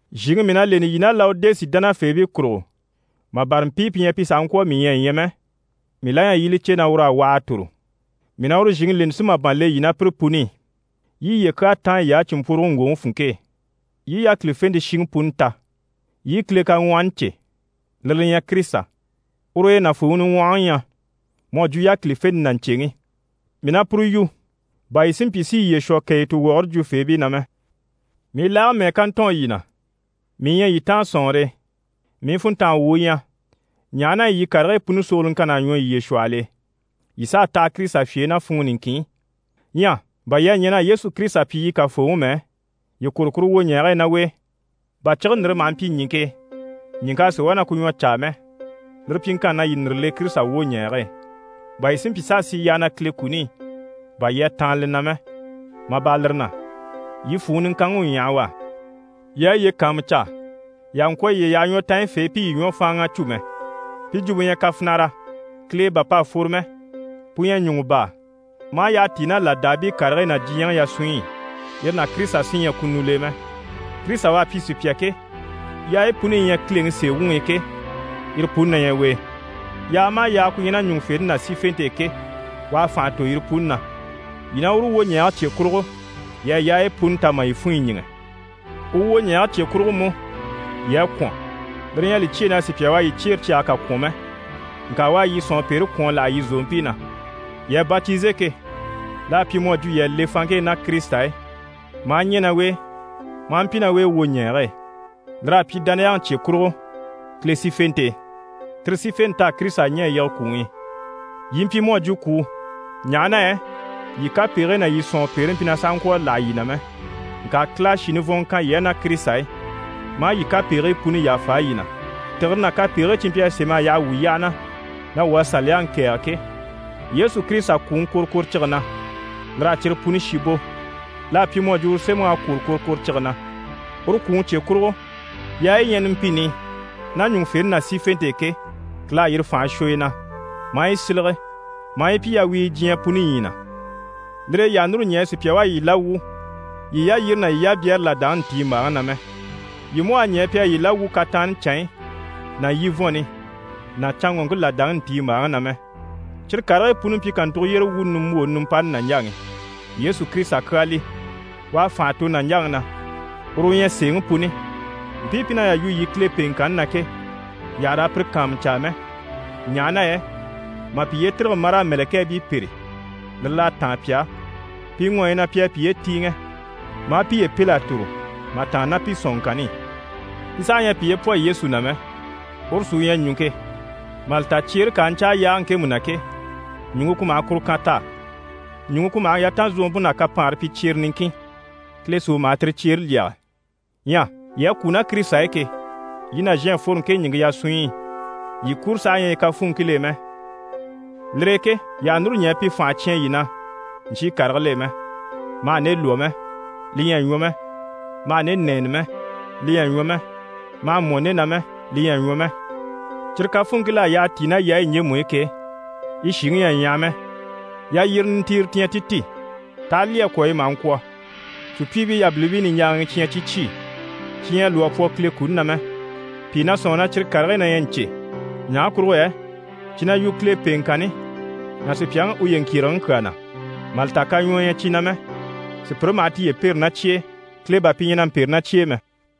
Zhìŋi mii na leni yii ná Lawodisi dánafeebii kurugo, mà bâra mpii pi ɲyɛ pi sàha ŋkwɔ̀ a mii ɲya a ɲya mɛ, mii la ɲyɛ yii i li cè na ur'à waha a tòro. Mii na uru zhìŋi leni si màban le yii ná pire puni i, yii i yiye kyaa táan yiy'á cìnmpworoge ŋgwòŋi funŋke e, yii i yákilifente shiŋi puni ta, yii i Kile kaŋwɔhɔni cè, lire li ɲyɛ Kirisita. Ur'e nàfuuŋi niŋwɔhɔŋi ɲyɛ mu à jwo yákilifente ná ɲcèŋi. Mii na puru yu bà yii si mpyi si yiye shwɔ kàyituwɔgɔre jwufeebii na mɛ. Mii laage mɛ́ɛ ká ntɔɔn yii na, mii ɲyɛ yii taan sɔ̀nŋɔre e. Mii funntanga wu u ɲyɛ, ɲaha na yɛ yii karigii puni sogoloŋkann'à ɲwɔ yiye shwɔhɔl'e, yii s'à taha Kirisita fye e ná funŋɔ niŋkin i. Ɲyɛ bà yii à ɲɛn'a Yesu Kirisita pyi yii Kafooŋi mɛ, yii kwôro kuru wwoɲɛɛge e ná u e. Bà cige ndìre maha mpyi ɲìŋke e, ɲìŋk'a sì wá na ku ɲwɔ caa mɛ, lire pyiŋkanni na, yii ndìre le Kirisita wwoɲɛɛge e, bà yii si mpyi s'a sì yyaha na Kile kuni i, bà yii à taanna li na mɛ. Mà bâra lire na, yii fwùŋi niŋkanŋi u ɲyaha u á. Yii a yiye kàanmucaa, yii àha ŋkwɔ̀ yiye yaha ɲwɔtanyifeebii pi yii ɲwɔ fáanŋa a cû mɛ. Pi jwumpe ɲyɛ kafinara, Kile e bà p'à fworo mɛ. Pu ɲyɛ ɲùŋɔ baa, maa yyaha tíi ná làdaabii karigii ná diɲyɛŋi yasunɲyi i, yire ná Kirisita sí ɲyɛ kunul'e mɛ. Kirisita u à pyi sùpya ke, yaayi puni yi ɲyɛ Kileŋi sèe wuŋi i ke, yire puni na ɲyɛ u e. Yaaga maha yaaga ku ɲyɛ ná ɲùŋufente ná sífente e ke, u à fànha tò yire puni na. Yii ná uru wwoɲɛɛge cye kurugo, yii à yaayi puni ta mà yii funɲyi ɲíŋɛ. U wwoɲɛɛge cye kurugo mú, yii à kwɔ̀n, lire ɲyɛ a li cyêe na sùpya u à yii cyeere cyage kà kwɔ̀n mɛ. Ŋka u à yii sɔ̀nŋɔpeere kwɔ̀n a láha yii zòompii na. Yii à batize ke, l'à pyi mu à jwo yii à le fanŋke e ná Kirisita e maa ɲɛ̀ ná u e maa mpyi ná u e wwoɲɛɛge e. Lir'à pyi dániyaŋi cye kurugo Kile sífente e. Tire sífente t'à Kirisita ɲɛ̀ a yige kwùŋi i. Yii mpyi mu à jwo kwùu, ɲaha na yɛ yii kapegigii ná yii sɔ̀nŋɔpeere mpyi na sàha ŋkwɔ̀ a láha yii na mɛ, ŋka Kile à shì nivɔnŋɔ kan yii á ná Kirisita e, maa yii kapegigii puni yàfa yii na. Tìgire ná kapegigii cyi mpyi a sém'a yaha wuu yyaha na, na wuu à Saliyaŋi kɛ̀ɛge ke, Yesu Kirisita kwùŋi kworokworocige na, lir'à cyire puni shi bò. L'à pyi mu à jwo uru sémɛŋ'à kwòro kworokworocige na. Uru kwùŋi cye kurugo, yaayi yi ɲyɛ numpini i ná ɲùŋufente ná sífente e ke, Kile à yire fànhe shwɔ yi na, maa yi sílege, maa yi pyi yawiige diɲyɛ puni ɲyii na. Lire e yii àha núru ɲɛɛ sùpya u a yii la wwû yii yalyire ná yii yabyɛɛre làdaŋi ntiimbaaŋi na mɛ. Yii mú àha ɲɛɛ pi a yii la wwû kataanni canɲyi ná yivɔnni ná canŋɔŋke làdaŋi ntiimbaaŋi na mɛ. Cyire karigii puni mpyi kàntugo yyére wuuni nimbwooni nimpani nàɲjaŋi. Yesu Kirisita kyaa li, u à fànha tò nàɲjaŋi na, uru u ɲyɛ sèeŋi puni. Mpii pi na yà yu yii Kile pèeŋkanni na ke, yii àha raa pire kàanmucaa mɛ, ɲaha na yɛ mà piye tîrige maraa mɛ̀lɛkɛɛbii pêre, lire l'à táan pi á. Pi ŋɔɔyi na pi à piye tíiŋɛ, maa piye pêl'a tòro, mà tàanna ná pi sɔ̀nŋɔŋkanni i. Pi saha ɲyɛ a piye pwɔ Yesu na mɛ, uru sí u ɲyɛ ɲùŋke, mà li ta cyeere ká a ɲcáa yaage ŋkemu na ke, ɲùŋke ku maha kuru kan t'á. Ɲùŋke ku maha yatanzogompe ná kapaanre pyi cyere niŋkin, Kile sí u maha tire cyeere lyɛge. Ɲyɛ yii à kwû ná Kirisita e ke, yii nàzhan à fworo ŋke ɲìŋke yasunɲyi i. Yii kuro saha ɲyɛ yi kafuunŋkil'e mɛ. Lire e ke yii àha núru ɲɛɛ pi fànhe cyán yii na ɲcyii karigil'e mɛ: «Ma hà nde lwɔ́ mɛ, li ɲyɛ a ɲwɔ mɛ. Ma hà nde nɛ́ɛnɛ mɛ, li ɲyɛ a ɲwɔ mɛ. Ma hà mpwɔ̀n nde na mɛ, li ɲyɛ a ɲwɔ mɛ.» Cyire kafuunŋkil'à yyaha tíi ná yaayi ɲjemu i ke, yi shìŋi ɲyɛ a ɲyaha mɛ. Yalyire nintiire ti ɲyɛ ti ti, t'aha lyî a kwɔ̀, yi maha ŋkwɔ̀. Sùpyiibii yabilimpii niɲjaaŋii cyi ɲyɛ cyi cyi, cyi ɲyɛ a lwɔ́ a pwɔ Kile kuni na mɛ. Pìi na sɔ̂nŋi na cyire karigii na ɲyɛ ɲcè, ɲaha kurugo yɛ cyi na yu Kile pèeŋkanni ná sùpyaŋi uye ŋkyèregeŋi kyaa na. Mà li ta, kaɲwɔɔ ɲyɛ cyi na mɛ, sùpyire maha tiye pêre ná cyi e, Kile bà pi ɲyɛ na mpêre ná cyi e mɛ.